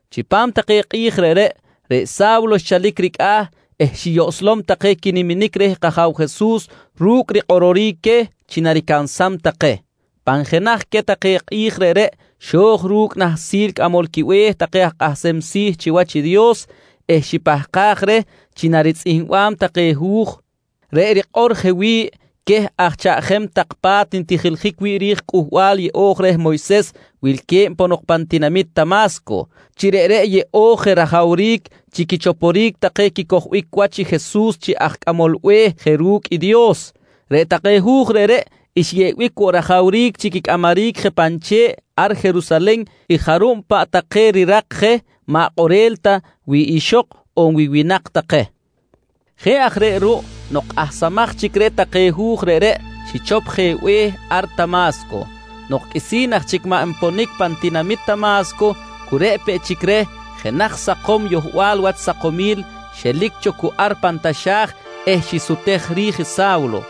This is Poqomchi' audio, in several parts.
Chipam take kꞌi̱j reꞌreꞌ, reꞌ Sa̱wlo xchalic ricꞌa̱ eh xiyoꞌslom take quiniminic reh kAja̱w Jesus ru̱cꞌ rikꞌororic queh chi naricansam take. Pan jenaj queh take kꞌi̱j reꞌreꞌ, xo̱j ru̱cꞌ i nahsil cꞌamol quibe̱h take aj kꞌahsem si̱ chiwach i Dios eh xipahkaj reh chi naritzꞌihmbam take hu̱j reꞌ erikꞌor je wi̱ꞌ queh aj chaꞌjem tak pa̱t ntijiljic wi̱ꞌ ri̱j i Cꞌuhbal Yeꞌo̱j reh Moyses wilque̱b ponok pan tinamit Tama̱sco, chi reꞌreꞌ yeꞌo̱j je rajawric chi quichoporic take quicojbic wach i Jesus chi Aj Cꞌamol Be̱h je ru̱cꞌ i Dios. Reꞌ take hu̱j reꞌreꞌ xyeꞌbic woꞌ rajawric chi quicꞌamaric je pan che̱ꞌ ar Jerusalen i jarub paꞌ take rirak je maꞌ kꞌorel ta wi ixok on winak take. Jeꞌ aj reꞌ ruꞌ nok kꞌahsamaj chic reh take hu̱j reꞌreꞌ, xichop je be̱h ar Tama̱sco. Nok qꞌuisi̱n aj chic maꞌ nponic pan tinamit Tama̱sco, cu reꞌ peꞌ chic reh jenaj sakom yohbal wach sakomil xelic cho cu ar pan taxa̱j eh xisutej ri̱j i Sa̱wlo.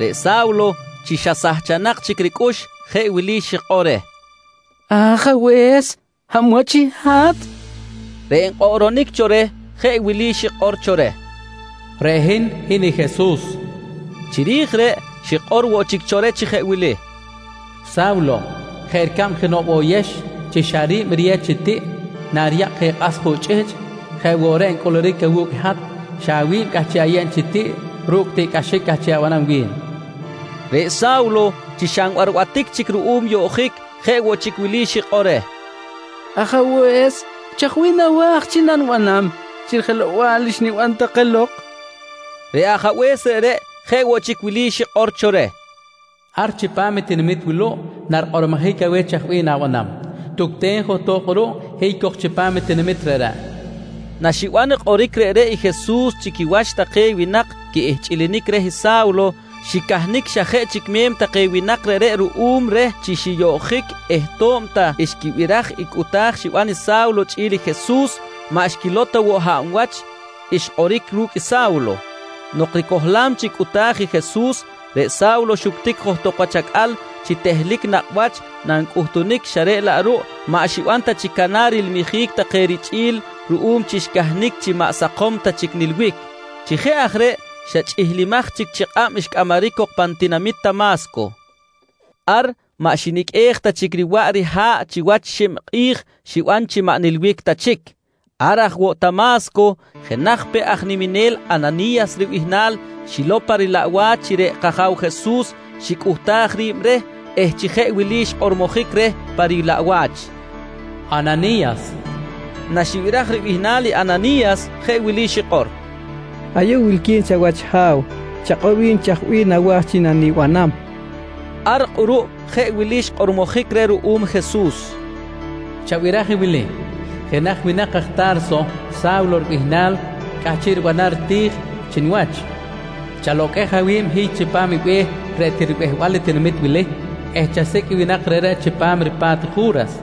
Reꞌ Sa̱wlo chi xa sahchanak chic ricꞌux jeꞌ wili xikꞌor reh: «Ajabe̱s, hab wach i hat? nqui reh. Reꞌ nkꞌoꞌronic cho reh jeꞌ wili xikꞌor cho reh: «Reꞌ hin, hin i Jesus, nqui cho reh. Chiri̱j reꞌ xikꞌor woꞌ chic cho reh chi jeꞌ wili: «Sa̱wlo, jeꞌ ricab jenoꞌ bo̱yex chi xa ri̱b riyew chi tiꞌ nariyakꞌ je i kꞌas juꞌ chꞌihchꞌ jeꞌ woꞌ reꞌ ncꞌuluric awu̱cꞌ hat, xa awi̱b cꞌahchiꞌ ayeb chi tiꞌ ru̱cꞌ i tiꞌcꞌaxic cꞌahchiꞌ abanam wi̱n, nqui reh. Reꞌ Sa̱wlo, chi xa nbarbatic chic ruꞌum yoꞌjic jeꞌ woꞌ chic wili xikꞌor reh: «Ajabe̱s, chaj bih nawa̱j chi nanibanam chi rijelow-bal xniban take lok? nqui reh. Reꞌ Ajabe̱s reꞌreꞌ jeꞌ woꞌ chic wili xikꞌor cho reh: «Ar chipam i tinamit wuluꞌ narikꞌormojic aweh chaj bih na̱banam. Tucten johtok kꞌuruꞌ hiy cok chipam i tinamit reꞌreꞌ, nqui reh. Naxiban kꞌoric reꞌreꞌ i Jesus chi quiwach take winak quiꞌihchꞌilinic reh i Sa̱wlo, xicahnic xa jeꞌ chic me̱m take winak reꞌreꞌ ruꞌum reh chi xiyoꞌjic eh to̱b ta xquibiraj i cꞌuta̱j xiban i Sa̱wlo chꞌi̱l i Jesus, maꞌ xquilow ta woꞌ wach hab wach i xkꞌoric ru̱cꞌ i Sa̱wlo. Nok ricohlam chic cꞌuta̱j i Jesus, reꞌ Sa̱wlo xuctic johtok wach acꞌal chi tehlic nakꞌ wach nancꞌutunic xa reꞌ laꞌ ruꞌ maꞌ xiban ta chic canar rilmijic take richꞌi̱l ruꞌum chi xcahnic chi maꞌ sakom ta chic nilbic. Chi jeꞌ aj reꞌ xa chꞌihlimaj chic chi kꞌab xcꞌamaric cok pan tinamit Tama̱sco. Ar maꞌ xiniqꞌuej ta chic riwaꞌ riha̱ꞌ chiwach i xib kꞌi̱j xiban chi maꞌ nilbic ta chic. Ar aj woꞌ Tama̱sco jenaj peꞌ aj niminel Anani̱yas ribihnal, xilow pa rilaꞌwach chi reꞌ kAja̱w Jesus xicꞌuhtaj ri̱b reh eh chi jeꞌ wili xkꞌormojic reh pa rilaꞌwach: «Anani̱yas, nqui xkꞌormojic reh. Naxibiraj ribihnal i Anani̱yas jeꞌ wili xikꞌor: «Ayuꞌ wilqui̱n chawach Ha̱w. Chakꞌor wi̱n chaj bih nawa̱j chi nanibanam, nqui xikꞌor. Ar kꞌuruꞌ jeꞌ wili xkꞌormojic reh ruꞌum Jesus: «Chabiraj i wili: Jenaj winak aj Ta̱rso, Sa̱wlo ribihnal cꞌahchiꞌ ribanam riti̱j chi niwach. Chaloqꞌuej awi̱b, hiy chipam i be̱h reꞌ til ribehbal i tinamit wili eh chasicꞌ i winak reꞌreꞌ chipam ripa̱t i Ju̱ras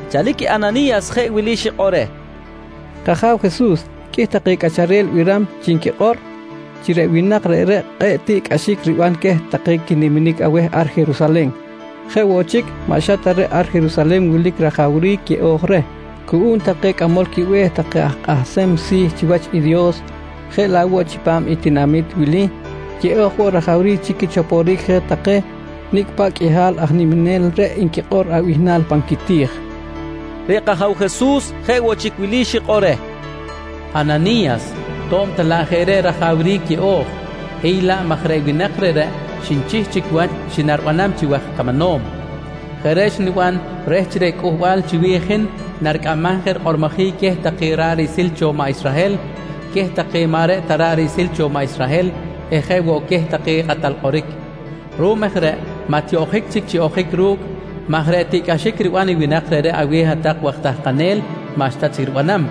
Chalic i Anani̱yas jeꞌ wili xikꞌor reh: «K-Aja̱w Jesus, qꞌuih take cꞌacharel biram chi nquikꞌor chi reꞌ winak reꞌreꞌ kꞌe̱ꞌ tiꞌcꞌaxic riban queh take quiniminic aweh ar Jerusalen. Jeꞌ woꞌ chic, maꞌ xa ta reꞌ ar Jerusalen wilic rajawric yeꞌo̱j reh cuꞌum take cꞌamol quibe̱h take aj kꞌahsem si̱ chiwach i Dios, jeꞌ laꞌ woꞌ chipam i tinamit wili yeꞌo̱j woꞌ rajawric chi quichoporic je take nicꞌ paꞌ qꞌuihal aj niminel reꞌ nquikꞌor abihnal pan quiti̱j, nqui Anani̱yas. Reꞌ kAja̱w Jesus jeꞌ woꞌ chic wili xikꞌor reh: «Anani̱yas to̱b ta laꞌ jeꞌ reꞌ rajawric yeꞌo̱j, hiy laꞌ maj reꞌ winak reꞌreꞌ xnichih chic wach chi naribanam chi waj camanom. Jeꞌ reꞌ xniban reh chi reꞌ cꞌuhbal chiwi̱j i hin naricꞌamam je rikꞌormojic queh take ra̱ꞌ riꞌsil cho maꞌ Israhel, queh take maꞌ reꞌ ta ra̱ꞌ riꞌsil cho maꞌ Israhel eh jeꞌ woꞌ queh take kꞌatal kꞌoric. Ruꞌum aj reꞌ maꞌ tiyoꞌjic chic chi ojic ru̱cꞌ maj reꞌ tiꞌcꞌaxic riban i winak reꞌreꞌ aweh hat-tak waj tahkanel maꞌxta chic ribanam,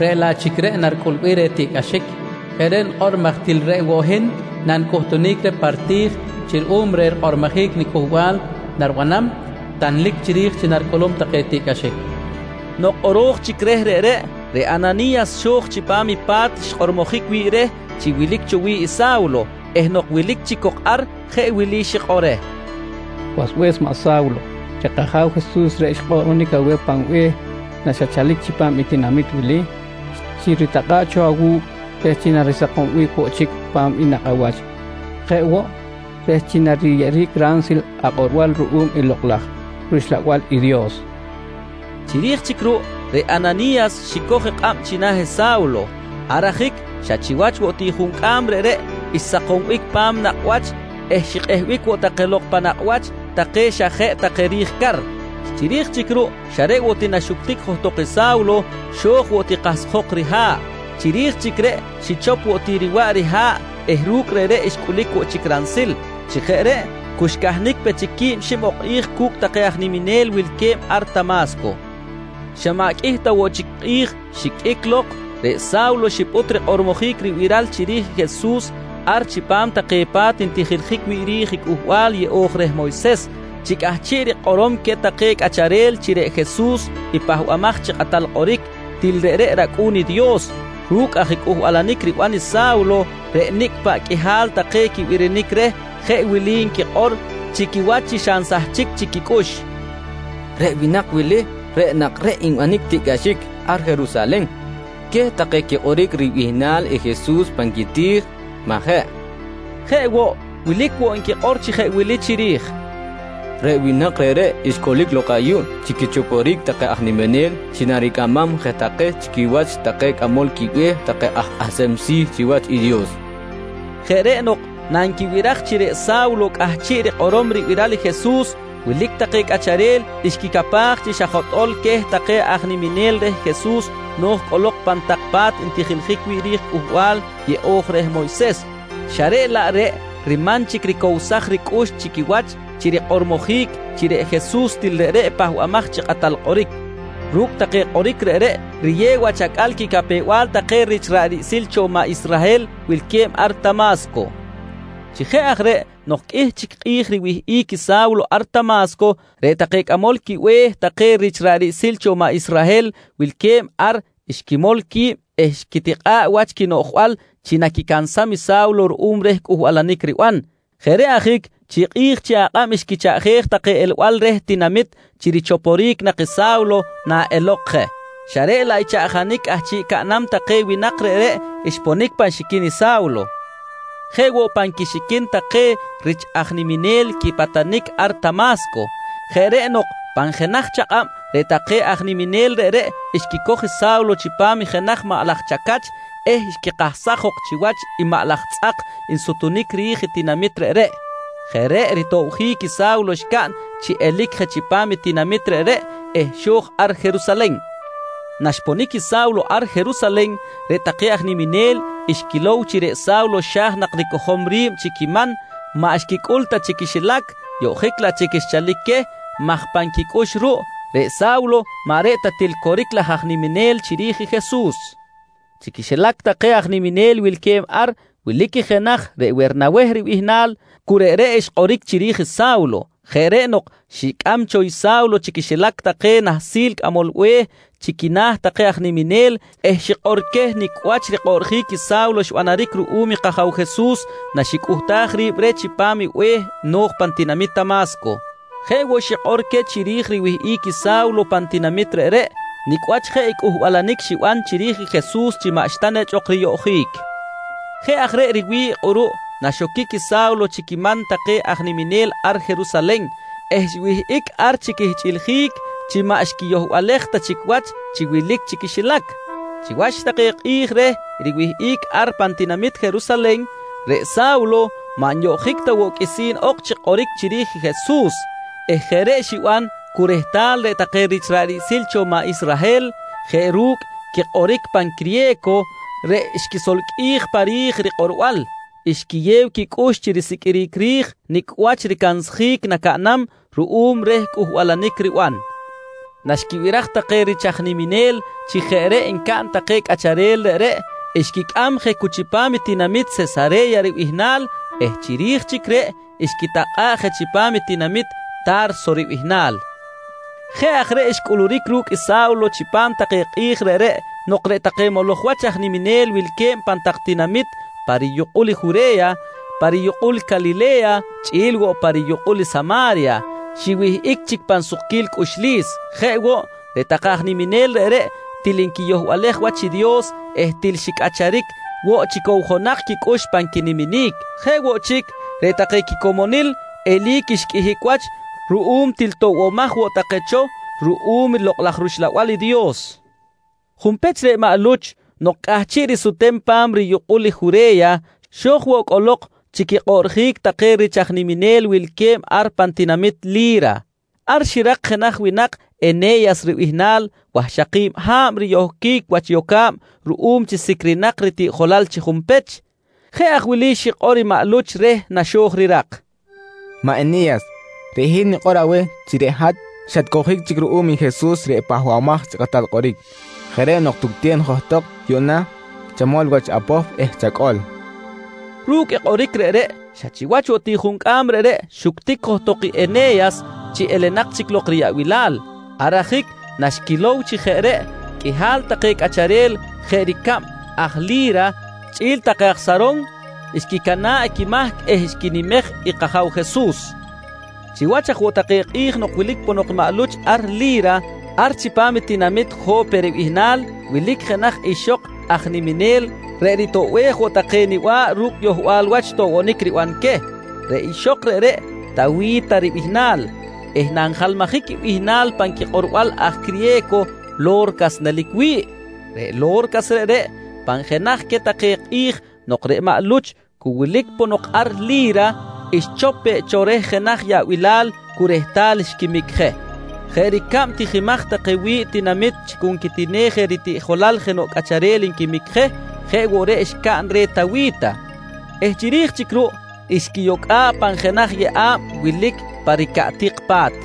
reꞌ laꞌ chic reꞌ naricꞌulbic reh tiꞌcꞌaxic. Jeꞌ reꞌ nikꞌor maj til reꞌ woꞌ hin nancꞌuhtunic reh pa riti̱j chi ruꞌum reh rikꞌormojic niCꞌuhbal naribanam, tanlic chiri̱j chi naricꞌulum take tiꞌcꞌaxic, nqui xikꞌor reh. Nok kꞌoro̱j chic reh reꞌreꞌ, reꞌ Anani̱yas xo̱j chipam i pa̱t xkꞌormojic wi̱ꞌ reh chi wilic cho wi̱ꞌ i Sa̱wlo eh nok wilic chic cok ar, jeꞌ wili xikꞌor reh: «Wasbe̱s maꞌ Sa̱wlo, reꞌ kAja̱w Jesus reꞌ xkꞌoꞌronic aweh pan be̱h naxatchalic chipam i tinamit wili, xiritakꞌa̱ꞌ cho awu̱cꞌ reh chi narisakombic woꞌ chic pa̱m i nakꞌ awach jeꞌ woꞌ reh chi nariyeꞌeric ransil akꞌorbal ruꞌum i Lokꞌ laj rUxlabal i Dios, nqui reh. Chiri̱j chic ruꞌ reꞌ Anani̱yas xicoj i kꞌab china̱ i Sa̱wlo. Ar ajic xa chiwach woꞌ ti juncꞌam reꞌreꞌ xsakombic pa̱m nakꞌ wach eh xikꞌehbic woꞌ take lok pan nakꞌ wach take xa jeꞌ take ri̱j car. Chiri̱j chic ruꞌ xa reꞌ woꞌ ti naxuctic johtok i Sa̱wlo, xo̱j woꞌ ti kahsjok riha̱ꞌ. Chiri̱j chic reꞌ xichop woꞌ chic riwaꞌ riha̱ꞌ eh ru̱cꞌ reꞌreꞌ xcꞌulic woꞌ chic ransil. Chi jeꞌ reꞌ cu xcahnic pe chic quib xib ok kꞌi̱j cu̱cꞌ take aj niminel wilque̱b ar Tama̱sco. Xa maꞌ qꞌuih ta woꞌ chic kꞌi̱j xiqꞌuic lok ruꞌ, reꞌ Sa̱wlo xipꞌut rikꞌormojic ribiral chiri̱j i Jesus ar chipam take pa̱t ntijiljic wi̱ꞌ ri̱j i Cꞌuhbal Yeꞌo̱j reh Moyses, chi cꞌahchiꞌ rikꞌorom queh take cꞌacharel chi reꞌ Jesus reꞌ i Pahbamaj chi Kꞌatal Kꞌoric, til reꞌreꞌ rAcꞌu̱n i Dios. Ru̱cꞌ aj cꞌuhbalanic riban Sa̱wlo, reꞌ nicꞌ paꞌ qꞌuihal take quibirinic reh jeꞌ wili nquikꞌor chi quiwach chi xa nsahchic chic quicꞌux: «Reꞌ winak wili reꞌ nak reꞌ nbanic tiꞌcꞌaxic ar Jerusalen queh take quikꞌoric ribihnal i Jesus pan quiti̱j, majeꞌ? nqui nquikꞌor. Jeꞌ woꞌ, wilic woꞌ nquikꞌor chi jeꞌ wili chiri̱j: «Reꞌ winak reꞌreꞌ xcꞌulic lok ayuꞌ chi quichoporic take aj niminel chi naricꞌamam je take chi quiwach take cꞌamol quibe̱h take aj kꞌahsem si̱ chiwach i Dios, nqui nquikꞌor. Jeꞌ reꞌ nok nanquibiraj chi reꞌ Sa̱wlo cꞌahchiꞌ rikꞌorom ribiral i Jesus, wilic take cꞌacharel xquicapaj chi xa jotꞌo̱l queh take aj niminel reh Jesus no̱j cꞌolok pan tak pa̱t ntijiljic wi̱ꞌ ri̱j i Cꞌuhbal Yeꞌo̱j reh Moyses, xa reꞌ laꞌ reꞌ riman chic ricowsaj ricꞌux chi quiwach chi rikꞌormojic chi reꞌ Jesus til reꞌreꞌ i Pahbamaj chi Kꞌatal Kꞌoric. Ru̱cꞌ take kꞌoric reꞌreꞌ riyew wach acꞌal i quicapew-bal take rich ra̱ꞌ riꞌsil cho maꞌ Israhel wilque̱b ar Tama̱sco. Chi jeꞌ aj reꞌ nok qꞌuih chic kꞌi̱j riwihꞌic i Sa̱wlo ar Tama̱sco, reꞌ take cꞌamol quibe̱h take rich ra̱ꞌ riꞌsil cho maꞌ Israhel wilque̱b ar xquimol qui̱b eh xquitikꞌa̱ꞌ wach quinoꞌjbal chi naquicansam i Sa̱wlo ruꞌum reh cꞌuhbalanic riban. Jeꞌ reꞌ ajic chi kꞌi̱j chi akꞌab xquichaꞌjej take elbal reh tinamit chi richoporic nak i Sa̱wlo na elok je, xa reꞌ laꞌ i chaꞌjanic cꞌahchiꞌ caꞌnam take winak reꞌreꞌ xponic pan xiquin i Sa̱wlo, jeꞌ woꞌ pan quixiquin take rich aj niminel quipatanic ar Tama̱sco. Jeꞌ reꞌ nok pan jenaj chakꞌab reꞌ take aj niminel reꞌreꞌ xquicoj i Sa̱wlo chipam jenaj maꞌ laj chacach eh xquikahsaj jok chiwach i maꞌ laj tzꞌak nsutunic ri̱j i tinamit reꞌreꞌ. Jeꞌ reꞌ ritobjic i Sa̱wlo xcaꞌn chi elic je chipam i tinamit reꞌreꞌ eh xo̱j ar Jerusalen. Naxponic i Sa̱wlo ar Jerusalen, reꞌ take aj niminel xquilow chi reꞌ Sa̱wlo xa̱j nak ricojom ri̱b chi quiman, maꞌ xquicꞌul ta chi quixilac yoꞌjic laꞌ chic xchalic queh maj pan quicꞌux ruꞌ, reꞌ Sa̱wlo maꞌ reꞌ ta til coric laj aj niminel chiri̱j i Jesus. Chi quixilac take aj niminel wilque̱b ar, wilic i jenaj reꞌ Wernaweh ribihnal, cu reꞌreꞌ xkꞌoric chiri̱j Sa̱wlo. Jeꞌ reꞌ nok xicꞌam cho i Sa̱wlo chi quiwach take nahsil cꞌamol be̱h chi quina̱ take aj niminel eh chi xikꞌor queh nicꞌ wach rikꞌoꞌrjic i Sa̱wlo xbanaric ruꞌum i kAja̱w Jesus naxicꞌuhtaj ri̱b reh chipam i be̱h no̱j pan tinamit Tama̱sco. Jeꞌ woꞌ xikꞌor queh chiri̱j riwihꞌic i Sa̱wlo pan tinamit reꞌreꞌ, nicꞌ wach jeꞌ i cꞌuhbalanic xiban chiri̱j i Jesus chi maꞌxta nechꞌ ok riyoꞌjic. Jeꞌ aj reꞌ riwi̱ꞌ kꞌuruꞌ naxoquic i Sa̱wlo chi quiman take aj niminel ar Jerusalen eh xwihꞌic ar chi quihchꞌiljic chi maꞌ xquiyohbalej ta chic chi wilic chi quixilac. Chiwach take kꞌi̱j reh riwihꞌic ar pan tinamit Jerusalen, reꞌ Sa̱wlo maꞌ nyoꞌjic ta woꞌ qꞌuisi̱n ok chi kꞌoric chiri̱j i Jesus eh jeꞌ reꞌ xiban cu rehtal reꞌ take rich ra̱ꞌ riꞌsil cho maꞌ Israhel jeꞌ ru̱cꞌ quikꞌoric pan criye̱co reꞌ xquisolqꞌuij pa ri̱j rikꞌorbal, xquiyew quicꞌux chi risiqꞌuiric ri̱j nicꞌ wach ricansjic nacaꞌnam ruꞌum reh cꞌuhbalanic riban. Naxquibiraj take rich aj niminel chi jeꞌ reꞌ ncaꞌn take cꞌacharel reꞌreꞌ, xquicꞌam je cu chipam i tinamit Sesare̱ya ribihnal eh chiri̱j chic reꞌ xquitakꞌa̱ꞌ je chipam i tinamit Ta̱rso ribihnal. Jeꞌ aj reꞌ xcꞌuluric ru̱cꞌ i Sa̱wlo chipam take kꞌi̱j reꞌreꞌ nok reꞌ take moloj wach aj niminel wilque̱b pan tak tinamit pa riyukꞌul Jure̱ya, pa riyukꞌul Calile̱ya chꞌi̱l woꞌ pa riyukꞌul Sama̱rya, xiwihꞌic chic pan sukquil cꞌuxlis. Jeꞌ woꞌ, reꞌ take aj niminel reꞌreꞌ til xquiyohbalej wach i Dios eh til xicꞌacharic woꞌ chi cowjonak quicꞌux pan quiniminic. Jeꞌ woꞌ chic, reꞌ take quicomonil eli̱c xqꞌuihic wach ruꞌum til toꞌbomaj woꞌ take cho ruꞌum Lokꞌ laj rUxlabal i Dios. Junpech reꞌ maꞌ Luch, nok cꞌahchiꞌ risutem pa̱m riyukꞌul i Jure̱ya, xo̱j woꞌ cꞌolok chi quikꞌoꞌrjic take rich aj niminel wilque̱b ar pan tinamit Li̱ra. Ar xirak jenaj winak Ene̱yas ribihnal wahxaki̱b ha̱b riyohquic wach yoca̱b ruꞌum chi sicrinak ritiꞌjolal chi junpech. Jeꞌ aj wili xikꞌor i maꞌ Luch reh na xo̱j rirak: «Maꞌ Ene̱yas, reꞌ hin nikꞌor aweh chi reꞌ hat xatcowjic chic ruꞌum i Jesus reꞌ Pahbamaj chi Kꞌatal Kꞌoric. Jeꞌ reꞌ nok tucten johtok yuꞌna, chamol wach apohp eh chacꞌol, nqui reh. Ru̱cꞌ kꞌoric reꞌreꞌ, xa chiwach woꞌ ti juncꞌam reꞌreꞌ xuctic johtok i Ene̱yas chi elenak chic lok riyaꞌbilal. Ar ajic naxquilow chi jeꞌ reꞌ, qꞌuihal take cꞌacharel jeꞌ ricab aj Li̱ra chꞌi̱l take aj Saron xquicana̱ꞌ quimahc eh xquinimej i kAja̱w Jesus. Chiwach aj woꞌ take kꞌi̱j nok wilic ponok maꞌ Luch ar Li̱ra, ar chipam i tinamit Jo̱pe ribihnal wilic jenaj ixok aj niminel reꞌ ritoꞌbej woꞌ take niba̱ꞌ ru̱cꞌ yohbal wach toꞌbonic riban queh. Reꞌ ixok reꞌreꞌ Tawi̱ta ribihnal eh nanjalmajic i bihnal pan quikꞌorbal aj criye̱co, Lo̱rcas nelic wi̱ꞌ. Reꞌ Lo̱rcas reꞌreꞌ, pan jenaj queh take kꞌi̱j nok reꞌ maꞌ Luch cu wilic ponok ar Li̱ra, xchop peꞌ cho reh jenaj yaꞌbilal cu rehtal xquimic je. Jeꞌ ricab tijimaj take wi̱ꞌ tinamit chi cu nquitinej je ritiꞌjolal jenoꞌ cꞌacharel nquimic je, jeꞌ woꞌ reꞌ xcaꞌn reh Tawi̱ta eh chiri̱j chic ruꞌ, xquiyocꞌa̱ꞌ pan jenaj yeꞌa̱b wilic ar pa ricaꞌtik pa̱t.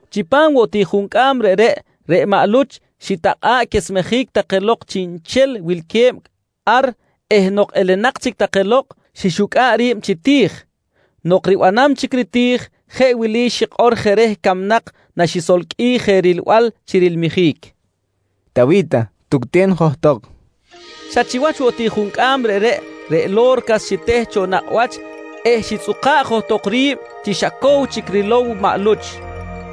Chipam woꞌ tiꞌ juncꞌam reꞌreꞌ, reꞌ maꞌ Luch xitakꞌa̱ꞌ quesmejic take lok chiꞌnchel wilque̱b ar eh nok elenak chic take lok, xixucꞌa̱ꞌ ri̱b chi ti̱j. Nok ribanam chic riti̱j, jeꞌ wili xikꞌor je reh camnak naxisolqꞌuij je rilbal chi rilmijic: «Tawi̱ta, tucten johtok, nqui reh. Xa chiwach woꞌ ti juncꞌam reꞌreꞌ, reꞌ Lo̱rcas xiteh cho nakꞌ wach eh xitzꞌuka̱ꞌ johtok ri̱b chi xa cow chic rilow i maꞌ Luch.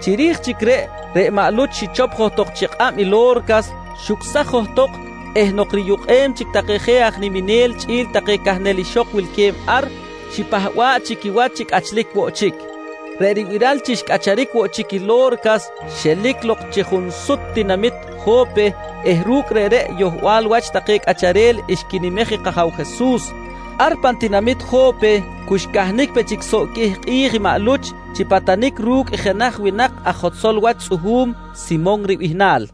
Chiri̱j chic reꞌ, reꞌ maꞌ Luch xichop johtok chi kꞌab i Lo̱rcas, xucsaj johtok eh nok riyukꞌem chic take je aj niminel chꞌi̱l take cahnel ixok wilque̱b ar, xipahba̱ꞌ chi quiwach chi cꞌachlic woꞌ chic. Reꞌ ribiral chi xcꞌacharic woꞌ chic i Lo̱rcas, xelic lok chi junsut tinamit Jo̱pe eh ru̱cꞌ reꞌreꞌ yohbal wach take cꞌacharel xquinimej i kAja̱w Jesus. Ar pan tinamit Jo̱pe cu xcahnic pe chic soꞌ qꞌuih kꞌi̱j i maꞌ Luch chi patanic ru̱cꞌ jenaj winak aj jotzol wach tzꞌuhu̱m, Simon ribihnal.